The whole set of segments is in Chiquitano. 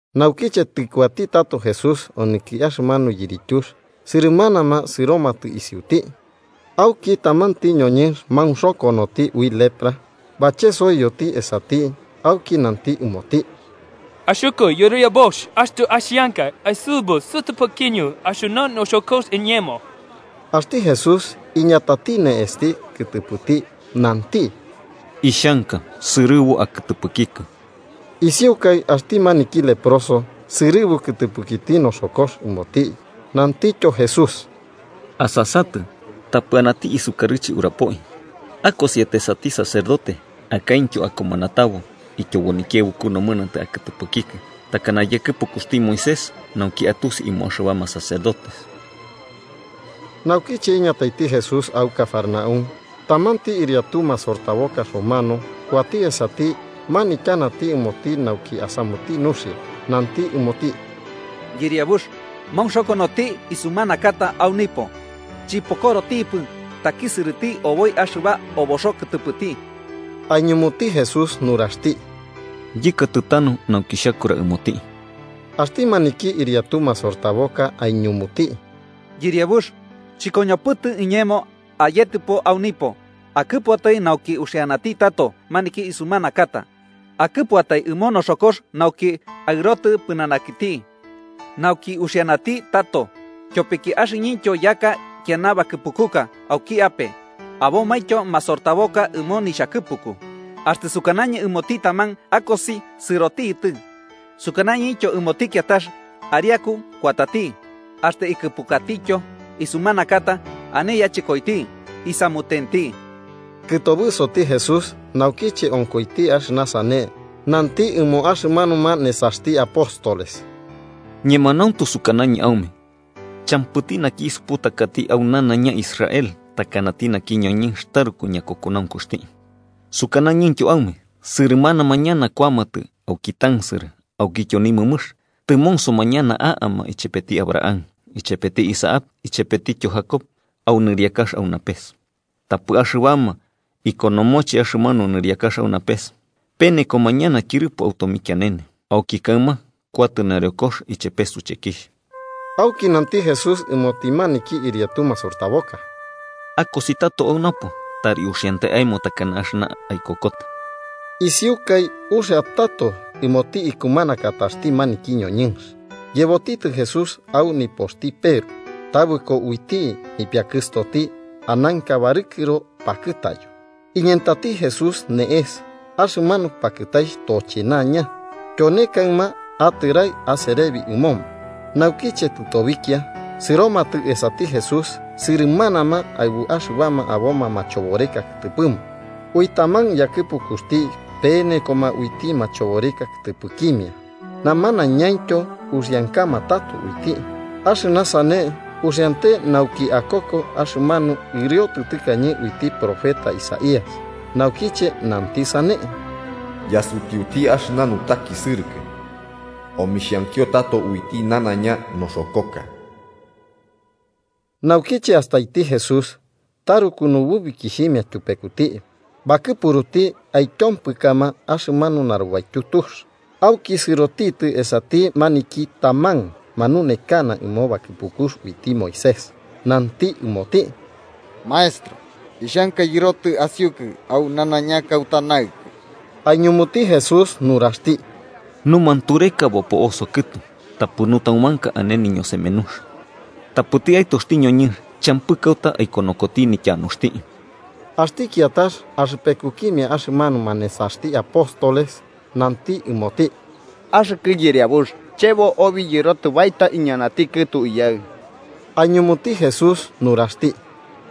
Naukiche tɨkuati tato Jesús onɨki axɨmanu yirityux, sɨrɨmanama sɨromatɨ isiuti. Auki tamanti ñoñɨnx maunxokonoti ui lepra, bachesoiyoti esati auki nanti ɨmoti: –Axɨkɨ Yɨriabux, axtɨ axianka, aisɨbu sɨtɨpɨkiñɨ axɨna noxokox iñemo. Axti Jesús iñatati ne'esti kɨtɨpɨti, nanti: –Ixhanka. ¡Sɨrɨbu akɨtɨpɨkikɨ! Isiukai, axti maniki leproso sɨrɨbu kɨtɨpɨkiti noxokox ɨmoti. Nantityo Jesús: –Asasatɨ, tapɨ anati isukarɨche urapoi. Akosiatai esati sacerdote, akaintyo akumanatabo, ityobo nikiaɨbuku nomɨnantɨ akɨtɨpɨkikɨ, takana yakɨpukuxti Moisés, nauki atusi ɨmoma axɨbama sacerdotes. Naukiche iñataiti Jesús au Cafarnaúm, tamanti ɨriatu masortaboka romano kuati esati manityanati ɨmoti nauki asamuti nuxia. Nanti ɨmoti: –Yɨriabux, maunxokonoti isumanakata au nipo, chɨpokorotipɨ takisɨrɨti oboi axɨba oboxo kɨtɨpɨti. Aiñumuti Jesús nuraxti: –Yɨkatɨ tanu nauki xhakura ɨmoti. Axti maniki ɨriatu masortaboka aiñunuti: –Yɨriabux, chɨkoñopɨtɨ iñemo ayetɨpo au nipo. Akɨpuatai nauki uxianati tato naki isumanakata. Akɨpuatai ɨmo noxokox nauki aɨrotɨ pɨnanakiti, nauki uxianati tato. Tyopiki axɨñɨntyo yaka ikiana bakɨpukuka auki ape, abomaintyo masortaboka ɨmo nixhakɨpuku. Axtɨ sukanañɨ ɨmoti taman akosi, sɨrotitɨ. Sukanañɨintyo ɨmoti kiatax ariaku, kuatati. Axtɨ ikɨpukatityo isumanakata ane yachɨkoiti, isamutenti. Kɨtobɨsoti Jesús naukiche onkoiti axɨna sane, nanti ɨmo axɨmanuma nesaxti apóstoles: –Ñemanauntu sukanañɨ aume champɨti naki isuputakati au nanaiña Israel takanati naki ñoñɨnx taruku ñakokonaunkuxti. Sukanañɨntyo aume sɨrɨmanama ñana kuamatɨ auki tansɨrɨ aukityo nimɨmɨx, tɨmonsoma ñana a'ama ichepeti Abraham, ichepeti Isaac ichepetityo Jacob au nɨriakax au napes, tapɨ axɨbama ikonomoche axɨmanu nɨriakax au napes, penekoma ñana tyɨrɨpo au tomikianene. Auki kaɨma kuatɨ nareokox ichepe suchekixh. Auki nanti Jesús ɨmoti maniki ɨriatu masortaboka: –Akosi tato au napo, tari uxiante aemo takana axɨna aikokota. Isiukai uxia tato ɨmoti ikumanakataxti maniki ñoñɨnx. Yebotitɨ Jesús au nipoxti Peru, tabɨko uiti nipiakɨstoti ananka barɨkɨro pakɨtayo. Iñentati Jesús ne'es, axɨmanu pakɨtaixh tochenaña, tyone kaɨma atɨrai aserebi ɨmoma. Naukiche tɨtobikia sɨromatɨ esati Jesús sɨrɨmanama aɨbu axɨbama aboma machoboreka kɨtɨpɨma. Ui taman yakɨpukuxti penekoma uiti machoboreka kɨtɨpɨkimia, namanañaintyo uxiankama tato uiti. Axɨna sane uxiante nauki akoko axɨmanu ɨriotɨ tɨkañe uiti profeta Isaías, naukiche nanti sane: “Yasutiuti axɨna nutakisɨrɨkɨ omixhankio tato uiti nanaiña noxokoka.” Naukiche astaiti Jesús taruku nububikixhimia tyupekuti, bakɨpuruti aityompɨkama axɨmanu narubaityu tux. Auki sɨrotitɨ esati tamanti maniki manunekanati ɨmo bakɨpukux uiti Moisés, nanti ɨmoti: –Maestro, ixhanka yɨrotɨ asiukɨ au nanaiña kauta naɨkɨ. Aiñumuti Jesús nuraxti: –Numantureka bopo'oso kɨtu tapɨ nutaumanka ane niñosemenux, tapɨti Aɨtoxti ñoñɨnx champɨ kauta aikonokoti nityanuxti. Axti kiatax axɨpekukimia axɨmanuma nesaxti apóstoles, nanti ɨmoti: –Axɨkɨ Yɨriabux, chebo obi yɨrotɨ baeta iñanati kɨtu iyaɨ. Aiñumuti Jesús nuraxti: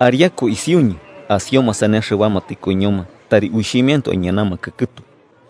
–Ariaku isiuñɨ, asioma sane axɨbama tɨkoiñoma tari uixhimiantoe aiñanamakɨ kɨtu.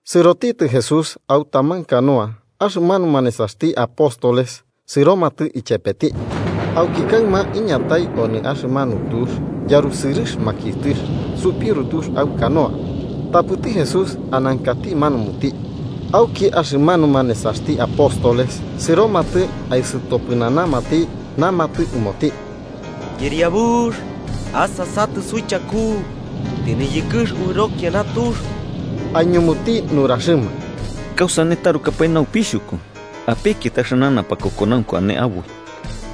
Sɨrotitɨ Jesús au taman canoa, axɨmanuma nesaxti apóstoles sɨromatɨ ichepeti. Auki kaɨma iñatai onɨ axɨmanu tux yarusɨrɨx makiɨtɨx supiuru tux au canoa. Tapɨti Jesús anakati manumuti. Auki axɨmanuma nesaxti apóstoles sɨromatɨ aisɨtopɨnanamati, namatɨ ɨmoti: –¡Yɨriabux, asasatɨ suichaku! ¡Tɨniyɨkɨx uɨro kiana tux! Aiñumuti nuraxɨma: –¿Kausane tarukapae naupixhuku? ¡Apekiatai axɨna napakokonaunku ane aboi!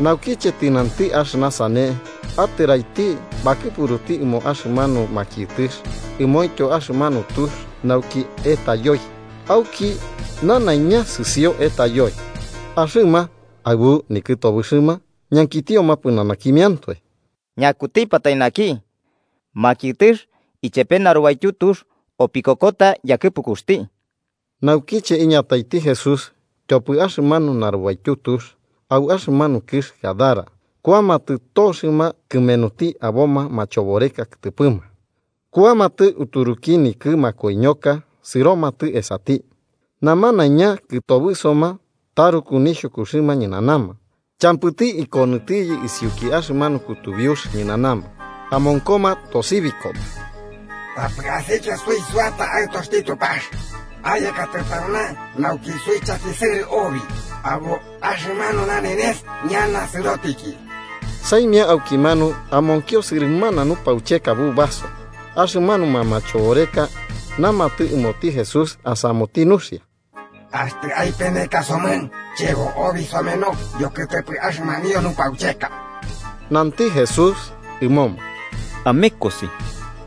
Naukiche tɨnanti axɨna sane, atɨraiti bakɨpuruti ɨmo axɨmanu makiɨtɨx ɨmointyo axɨmanu tux nauki etayoi, auki nanaiña sɨsio etayoi. Axɨma, aɨbu nikɨtobɨxɨma, ñankitioma pɨnanakimiantoe: –¿Ñakutipatai naki, makiɨtɨx ichepe narubaityu tux opikokota yakɨpukuxti? Naukiche iñataiti Jesús tyopɨ axɨmanu narubaityu tux, au axɨmanu kɨx Gadara, kuamatɨ toxɨma kɨmenuti aboma machoboreka kɨtɨpɨma kuamatɨ uturuki nikɨ makoiñoka sɨromatɨ esati. Namanaiña kɨtobɨsoma taruku nixhukuxɨma ñɨnanama champɨti ikonɨtiyɨ isiuki axɨmanu kutubiux ñɨnanama. Amonkoma tosibikoma: –¡Tapɨ asikia suisuata, Aɨtoxti Tupax! ¿Ayekatɨ tauna nauki suichakisɨrɨ obi abo axɨmanu nanenes ñana sɨrotiki? Saimia aukimanu amonkio sɨrɨmana nupaucheka bubaso, axɨmanuma machoboreka namatɨ ɨmoti Jesús asamuti nuxia: –Axtɨ aipeneka somɨ, chebo obi someno yokɨtɨpɨ axɨmanio nupaucheka. Nanti Jesús ɨmoma: –Amekosi.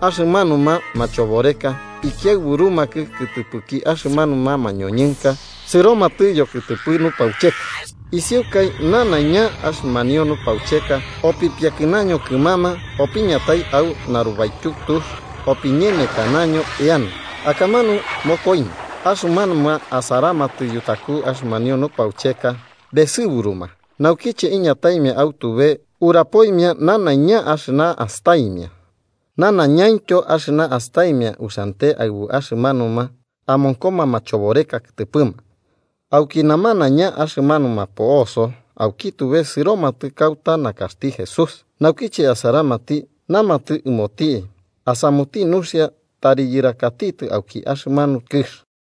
Axɨmanuma machoboreka ikiaɨburumakɨ kɨtɨpɨki axɨmanuma mañoñɨnka sɨromatɨ yokɨtɨpɨ nupaucheka. Isiukai nanaiña axɨmanio nupaucheka opipiakɨnaño kɨmama opiñatai au narubaityu tux opiñemekanaño eana, akamanu mokoiño. Axɨmanuma asaramatɨ yutaku axɨmanio nupaucheka besɨburuma, naukiche iñataimia au tube urapoimia nanaiña axɨna astaimia, nanaiñaintyo axɨna astaimia uxiante aɨbu axɨmanuma amonkoma machoboreka kɨtɨpɨma. Auki namanaiña axɨmanuma po'oso auki tube sɨromatɨ kauta nakaxti Jesús, naukiche asaramati namatɨ ɨmoti asamuti nuxia tari yɨrakatitɨ auki axɨmanu kɨx.